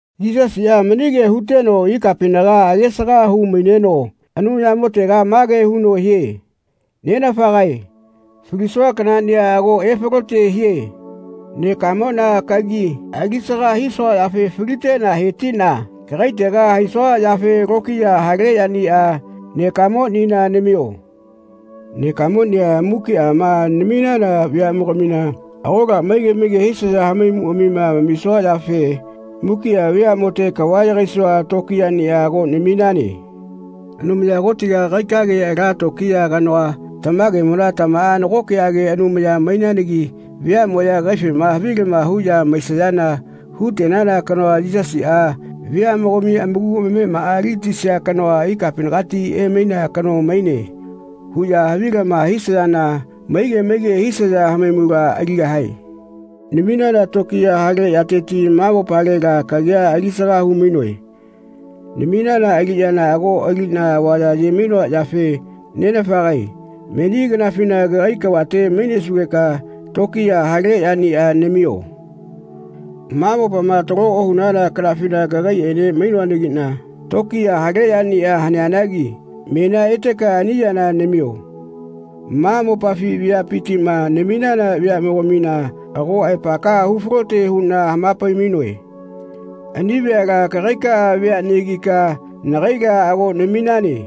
Yisasiꞌa mani kea huteno ikapinaga age-saga hu-maineno Anumayamotega mage huno hie “Nenafagae falisua kanaꞌnia ago efalote hie. Nekamoꞌna kagi ali-saga hisua yafe faliteꞌna he-tiꞌna kagaitega haisua yafe lokiya hale yania nekamonina namio. Nekamonia mukiꞌama naminana veaꞌmogamina agola maige maige hisaya hamaimuꞌamima amamisua yafe mukiꞌa veaꞌmote kava yagaisua tokiyaꞌnia ago naminane. Anumaya Kotiga kagaikage ala tokiya kanoa tamagemona tamaꞌa nagokeꞌage Anumaya mainanagi veaꞌmoꞌya kagaifema havilama huꞌya maisayana hu-tenana kanoa ‘Yisasiꞌa veaꞌmogami amaku amamemaꞌa ali-gatisia kanoa ikapinagati emainea kano maine.’ huꞌya havilama hisayana maige maige hisaya hamaimula aligahae. Naminana tokiya hale yatetiꞌa ma mopalela kagia alisaga hu-mainoe. Naminana aliꞌyana ago aliꞌna avaya aye-mainoa yafe Nenafagae meni kanafina kagai kavate mainesugeka tokiya hale yaniꞌa namio. Ma mopama talo ohunana kanafina kagaiꞌene mainoanagiꞌna tokiya hale yania haneanagi menia eteka ani yana namio. Ma mopafi veapitiꞌma naminana veaꞌmogamina ago aepakaꞌa hu-falote huꞌna hama-pai-mainoe. Ani veala kagaikaꞌa veaꞌnegika nagaila ago naminane.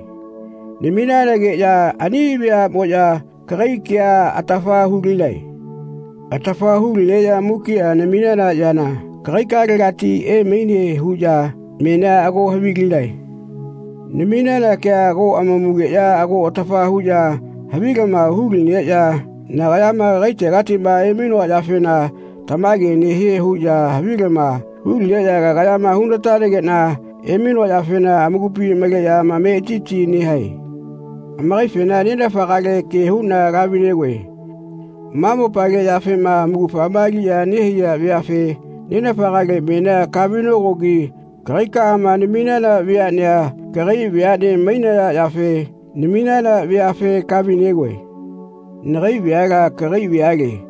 Naminanageꞌya ani veaꞌmoꞌya kagai kea atafa hu-linae. Atafa hu-lineꞌya mukiꞌa naminana yana kagaikaꞌalegati emaine huꞌya menia ago havilinae. Naminana kea ago amamugeꞌya ago atafa huꞌya havilama hulineꞌya nagayama kagaitegatiꞌma emainoa yafena tamage nehie huꞌya havilama hu-lineꞌya kagayama hu-na-tanageꞌna emainoa yafena amakupi maleꞌya amametiti nehae. Amakaifena Nenafagale ke huꞌna kahavi-negoe. Ma mopale yafema amaugafa aliꞌya nehaiya veafe Nenafagale menia kahavi-nokogi kagaikaꞌama naminana veaꞌnea kagai veaꞌne mainaya yafe naminana veafe kahavi-negoe. Nagai veala kagai veale.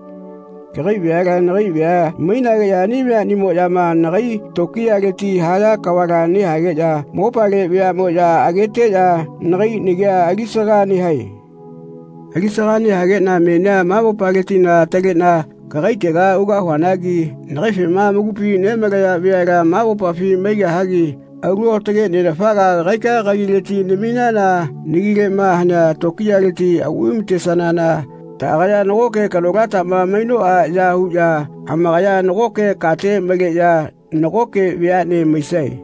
Kagai veala nagai vea mainageꞌya ani veaꞌnimoꞌyama nagai tokiyaleti haya kavala nehageꞌya mopale veaꞌmoꞌya ageteꞌya nagai nagia alisaga nehae. Ali-saga nehageꞌna menia ma mopaletila ataleꞌna kagaitega ugahuanagi nagaifema amakupi nemalaya veala ma mopafi maigahagi alu aotage Nenafaga kagaika kagileti naminana nagileꞌma hanea tokiyaleti auꞌvai-ma-tesanana taꞌagaya nagoke kanolatama mainoꞌa ya huꞌya amakaya nagoke kate maleꞌya nagoke veaꞌne maisae.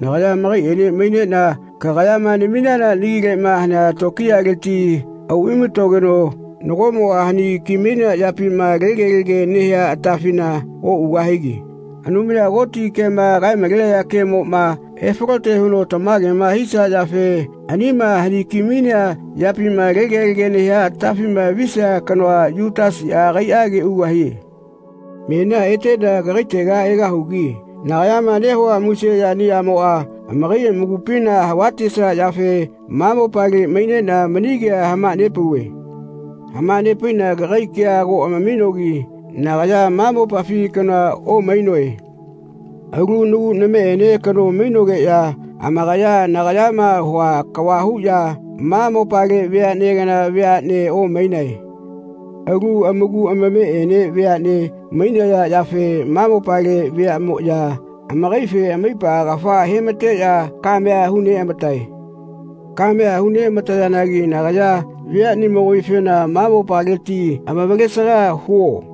Nagaya amakaiꞌene maineꞌna kagayama naminana nagileꞌma hanea tokiyaleti auꞌvai-ma-togeno nagoꞌmoꞌa hani-ki-mainea yapima tegelege nehia atafina oꞌugahagi Anumaya Koti kema kae-malenaya kemoꞌma efalote huno tamagema hisia yafe anima hani-ki-mainea yapima tegelege nehia atafima visia kanoa Yutasiꞌa agaiꞌage ugahie. Menia eteꞌna kagaitega egahugi nagayama nehua muse yaniꞌamoꞌa amakai amakupina hava-tesia yafe ma mopale maineꞌna mani kea hama-nepauve. Hama-nepaiꞌna kagai kea ago amaminogi nagaya ma mopafi kanoa omaiꞌnoe. Alu nagu nameꞌene kano mainogeꞌya amakaya nagayama hua kava huꞌya ma mopale veaꞌne kana vea omainae. Alu amaku amameꞌene veaꞌne mainaya yafe ma mopale veaꞌmoꞌya amakaife amaipa kafa he-ma-teꞌya kamea hu-neꞌama-tae. Kamea hu-neꞌama-tayanagi nagaya veaꞌnimogamifena ‘Ma mopaleti amavalesaga huo.’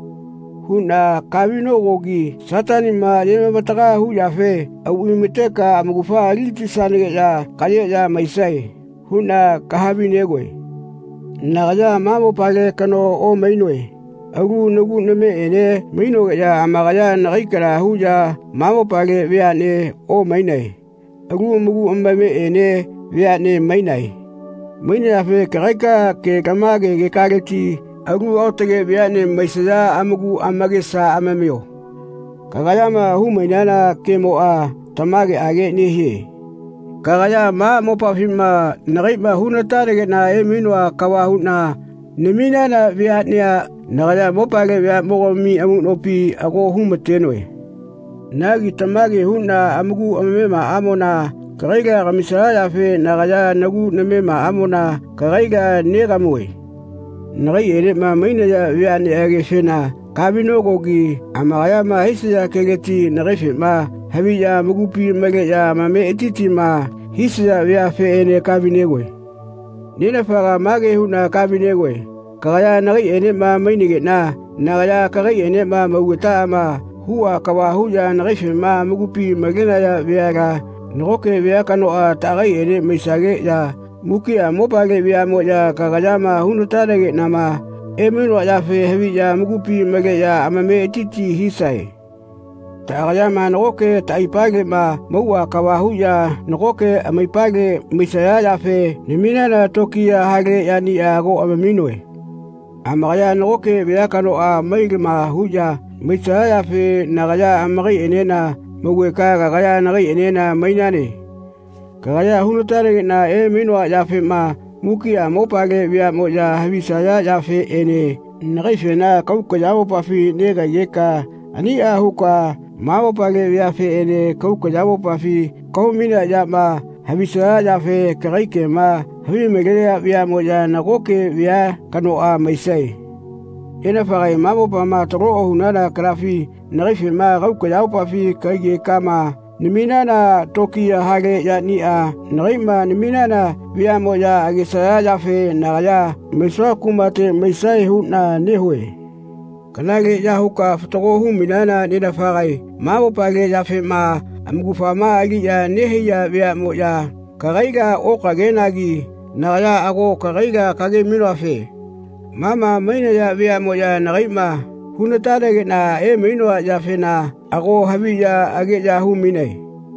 huꞌna kahavi-nokogi ‘Sataniꞌma aye-mavataga hu yafe auꞌvai-mateka amaugafa ali-gatisanageꞌya kaꞌyeꞌya maisae.’ huꞌna kaha-vi-negoe. Nagaya ma mopale kanoa omaiꞌnoe. Alu nagu nameꞌene kano mainogeꞌya amakaya nagai kana huꞌya ma mopale veaꞌnea omainae. Alu amaku amameꞌene veane mainae. Mainayafe kagaika ke-lamage kekaleti alu aotage veaꞌne maisaya amaku amakesa amamio. Kagayama hu-mainana kemoꞌa tamageꞌage nehie. Kagaya ma mopafima nagaiꞌma hu-natanageꞌna emainoa kava huꞌna naminana veaꞌnea nagaya mopale veaꞌmogami amuꞌnopi ago hu-ma-tenoe. Nagi tamage huꞌya amaku amamemaꞌamona kagaila kamisaya yafe nagaya nagu namemaꞌamona kagaila negamue. Nagaiꞌenema mainaya veaꞌneꞌagefena kahavi-nokogi amakayama hisaya keleti nagaifema haviꞌya amakupi maleꞌya amametitima hisaya veafeꞌene kahavi-negoe. Nenafagae mage huꞌna kahavi-negoe kagaya nagaiꞌenema mainageꞌna nagaya kagaiꞌenema maugetaꞌama huꞌa kava huꞌya nagaifema amakupi malenaya veala nagoke vea kanoꞌa taꞌagaiꞌene maisageꞌya mukiꞌa mopale veaꞌmoꞌya kagayama hu-na-tanageꞌnama emainoa yafema haviꞌya amakupi maleꞌya amametiti hisae. Taꞌagayama nagoke taꞌaipaleꞌma mauꞌa kava huꞌya nagoke amaipale maisaya yafe naminana tokiya hale yaniꞌa ago amaminoe. Amakaya nagoke vea kanoꞌa mai-lama huꞌya maisaya yafe nagaya amakaiꞌenena maugeka kagaya nagaiꞌenena mainane. Kagaya hu-na-tanageꞌna emainoa yafema mukiꞌa mopale veaꞌmoꞌya havisaya yafeꞌene nagaifena kahau kayamopafi negahaigeka aniꞌa huka ma mopale veafeꞌene kahau kayamopafi kahau-mainea yama havisaya yafe kagai kema havimalenaya veaꞌmoꞌya nagoke vea kanoꞌa maisae. Nenafagae ma mopama taloma ohunana kanafina nagaifena kahau kayamopafi kahaigekama naminana tokiya hale yaniꞌa nagaiꞌma naminana veaꞌmoꞌya agesaya yafe nagaya maisua kumate maisae huꞌna nehue. Kanaleꞌya huka fatago hu-mainana Nenafagae ma mopale yafema amaugafa aliꞌya nehaiya veaꞌmoꞌya kagaila okagenagi nagaya ago kagaila kage-mainoafe ma ma mainaya veaꞌmoꞌya nagaiꞌma hu-na-tanageꞌna emainoa yafena ago haviꞌya ageꞌya hu-mainae.